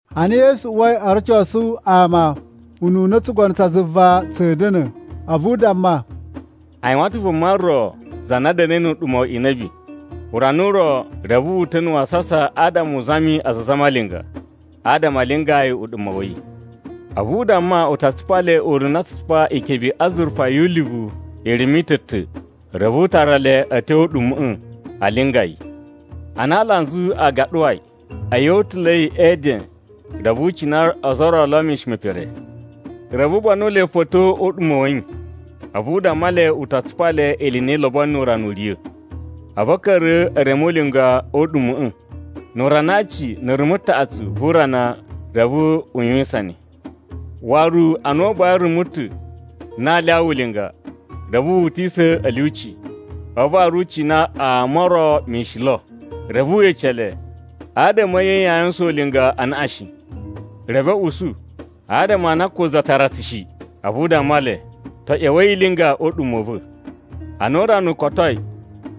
Ana Yesu uwai o rocosu ama ununa tsugono tsa zuva tsa̱a̱ da̱na̱, a̱vu u damma, “A yuwan ta̱ vuma ro za na da̱na̱i nu uɗuma̱ wa inabi. Urana u ro, reve wu uta̱ na̱ wasasa adama u zami aza a zamalinga adama a lingaa yi uɗuma̱ wa̱ yi. A̱vu u damma u ta tsupa le ununa a tsu tsupa ikebe i azurufa yu ulivu irumu i ta̱ ta̱. Reve u tara le a̱ tyo o uɗuma̱ꞌa̱ a linga yi. “Ana alanzu a gaɗuwai, a̱yi o utula̱i e eden reve u cina ozo o ro lo a̱ mishin me pere. Reve u banu le fo a̱ tyo o uɗuma̱ wa̱ yi, a̱vu u damma le u ta tsupa le ili i na i lobonoi nu urana u riya̱. A̱vu a̱ ka̱ra̱ e reme ulinga o uɗuma̱ꞌa̱. “Nu urana a aci na̱ rumu taꞌatsu vu urana reve u yuwisan ne. Waru ana u buwai rumu ta̱ na aa lyawa ulinga, reve wu utisa̱ a̱ lyuci, a̱vu waru u cina ama o ro mishin lo. Reve we ece le, ‘Adama a̱ nye yaa yuwusan ulinga anaꞌan shi?’ “Reve a̱ usu, ‘Adama a na ko za tara tsu shi!’ “A̱vu u damma le, ‘To, ꞌya̱wa̱i i linga o uɗuma̱ u va̱.’ “Ana urana u kotoi,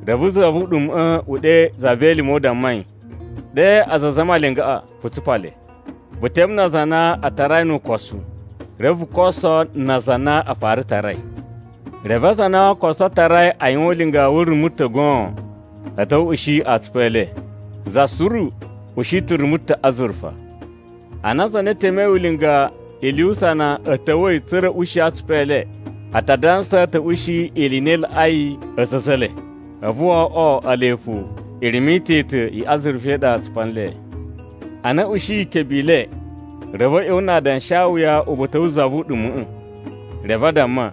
reve za vu uɗuma̱ꞌa̱ u ɗe za ve elime u damma yi, ‘Ɗe aza a zamalingaꞌa vu tsupa le. Vu teme na aza a na n tarai nu ukosu, reve vu koso na aza a na n fara tarai.’ “Reve aza a na o koso tarai a yuwan ulinga wu rumu ta̱ goon a̱ ta̱wa̱ a̱ ushi atsupu e le, za suru ushi ta̱ rumu ta̱ azurufa. Ana aza a na e temei ulinga ili yu usana a̱ ta̱wa̱i tsa̱ra̱ a̱ ushi atsupu e le, a ta dansa a̱ ta̱ ushi ili i na i laꞌai a̱za̱ a̱ a̱za̱ e le. A̱vu wo oꞌwo ele fo irumu i ta̱ ta̱ i azurufa i ɗa a tsupa nle. Ana a̱ ushiyi ikebe i le, reve a̱ ꞌya̱wa̱ na adanshawuya uba̱ta̱ wu za vu uɗuma̱ꞌa̱. Reve a damma,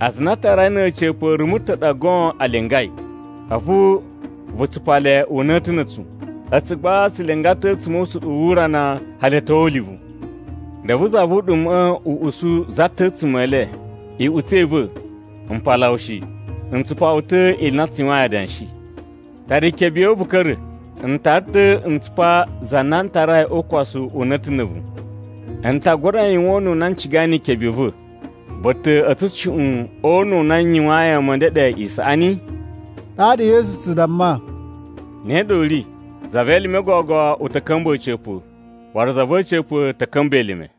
‘Aza a na a tarai na̱ a̱ca̱pa̱ rumu ta̱ ɗa goon a lingai. A̱vu vu tsupa le una̱ta̱ na̱ a̱tsu. A̱tsu gba tsu linga ta̱ a̱tsuma̱ o usuɗuwu wu urana hali a̱ tyo ulivu!’ “Reve za vu uɗuma̱ꞌa̱ u usu za ta̱ a̱tsuma̱ e le, ‘Iꞌutsa̱ i va̱, m paala wu shi. N tsupa wu ta̱ ili i na tsu yuwain adanshi. Tara ikebe ya̱ wu vu ka̱ra̱! N tara ta̱ n tsupa za na a tarai o ukosu una̱ta̱ na̱ a̱vu. N ta gura yuwan ununa n cigai ni ikebe i va̱. Vu ta̱ a̱ tsushuꞌun o una̱ u na n yuwayin ama a̱ ndeɗe isaꞌani?’” Ɗaɗa Yesu tsu damma, “Ne ɗa u ri. Za ve elime gogo u ta̱ ka̱mba̱ a̱ca̱pa̱, waru za va̱ a̱ca̱pa̱ ta̱ ka̱mba̱ elime.”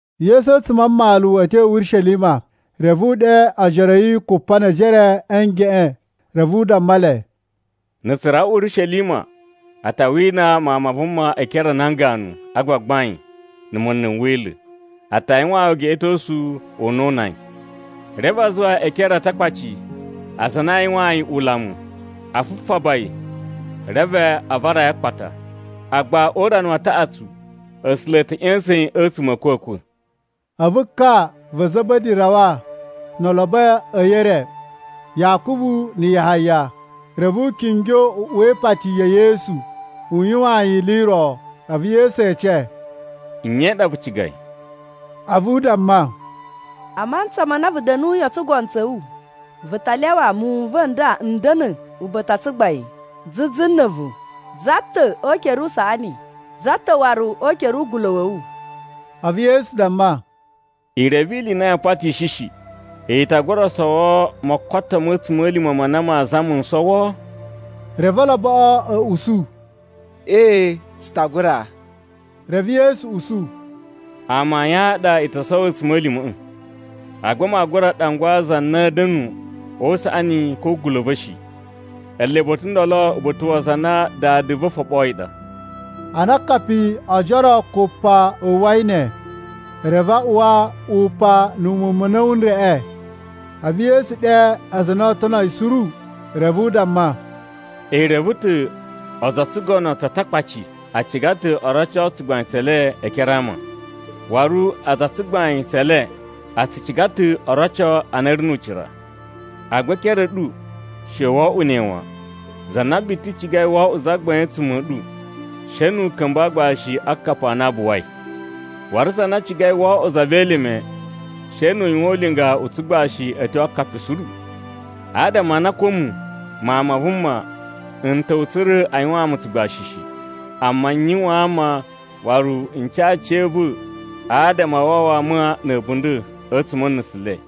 Yesu a̱tsuma̱ a mmalu a̱ tyo Urishelima, reve u ɗe ojoro a̱ yi kupa ne ejere a̱ ngeꞌen a̱vu u damma le, “Na̱ tsu rawa Urishelima a ta wina Mawun ma Vuma e ekere a nan ganu a gbagbain na̱ munlu n Wila̱. A ta yuwaan yi ugeꞌetosu u na oo una yi. Reve a zuwa yi e ekere a Atakpaci aza a na aa yuwaan yi ulamu, a fufaba yi, reve a vara yi a akpata. Agba o urana wa taꞌatsu A̱sula̱ a̱ ta̱ ꞌya̱sa̱n yi a̱tsuma̱ a̱ a̱kwa̱kwa̱.” A̱vu ka va̱ Za̱ba̱di rawa no olobo a̱ yi e re, Yakubu na̱ Yahaya. Reve u kingyo u uwa ipati ya̱ Yesu yuwaan yi ili i ro. A̱vu Yesu ece, “Nye i ɗa vu cigai?” A̱vu u damma, “A mantsa ma na vu da̱nuyi o tsugono tsa̱ wu, vu ta lyawa muwun n va̱ n nda a̱ da̱nu uba̱ta̱ u tsugbain zuzu na̱ a̱vu, za ta̱ o ukere usaꞌani za ta̱ waru o ukere ugula̱ wa̱ wu?” A̱vu Yesu damma, “I reve ili i na yaa patishi shi. I ta gura sowo mokoto ma̱ a̱tsuma̱lima̱ ma na maa zama n sowo?” Reve oloboꞌo a̱ usu, “Ee, tsu ta gura.” Reve Yesu usu, “Amayun a ɗa i to sowo a̱tsuma̱lima̱ꞌa̱! Agba maa gura ɗangwa za na a̱a̱ da̱nu o usaꞌani ko o ugula̱ u va̱ shi. Ele ba̱ta̱ ndolo uba̱ta̱ wa aza a na Dada va̱ foɓoyi ɗa.” Ana akapi o ojoro kupa a uwwai ne, reve a uwa upan na̱ muwun ma̱ a̱na̱wu n reꞌe. A̱vu Yesu ɗe aza a na oo tono yi suru reve u damma, “I reve ta̱ a̱za̱ o tsugono tsa Atakpaci a ciga ta̱ o roco tsugbain tse le e ekere a ama. Waru aza a tsugbain tse le a tsu ciga ta̱ o roco a na a̱ ri nu ucira. Agba e ekere a̱ ɗu, she wo oꞌwo ne wan. Za na biti cigai wo oꞌwo zagbain a̱tsuma̱ a̱ ɗu, she nu u ka̱mba̱ aagbashi a akapi a na a buwai. Waru za na cigai wo oꞌwo za ve elime, she nu u yuwan ulinga u tsugbashi a̱ tyo a akapi suru. Adama a na ko a̱mu, Mawun ma Vuma n ta̱wa̱ tsa̱ra̱ a yuwaan mu tsugbashi shi, amma n yuwaan ama, waru n ca aciya̱va̱ adama a wawa ama na̱ a̱bunda̱ a̱tsuma̱ a̱ nusu le.”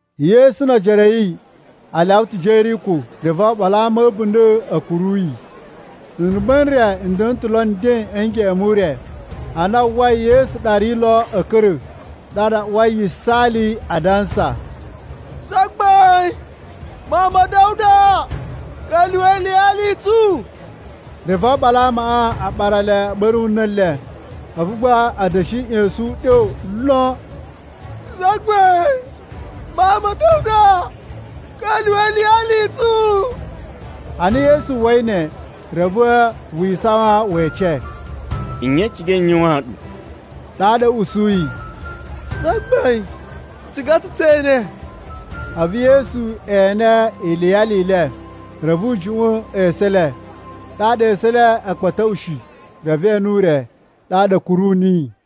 Yesu no ojoro a̱ yi a lyawa ta̱ Jeriko, reve oɓolo a ama a̱ a̱bunda̱ a̱ kuru yi. Nrumba̱ n re n da̱na̱ ta̱ lo nden a̱ ngeꞌen mu ure. Ana a uwwai Yesu ɗa ri lo a̱ ka̱ra̱, ɗaɗa a uwai yisaali adansa, “Zagbain, Mawun ma̱ Da̱wuda! Ka̱lyuwa̱ iliyali i tsu!” Reve oɓolo a amaꞌa a ɓara le a̱ ɓa̱ru na̱ le, a̱vu gba a̱ da̱shi ꞌya̱sa̱n uɗyo lon, “Zagbain, Mawun ma̱ Da̱wuda! Ka̱lyuwa̱ iliyali i tsu!” Ana Yesu uwwa nle, reve wi isawan we ece, “Nye i cigai n yuwaan ɗu?” Ɗaɗa a̱ usuyi, “Zagbain, tsu ciga ta̱ tse ene!” A̱vu Yesu ene iliyali i le, reve u juꞌwa̱n esu e le. Ɗaɗa esu e le a̱ kpa̱tuꞌushi, reve e ene ure, ɗaɗa a̱ kuru niyi.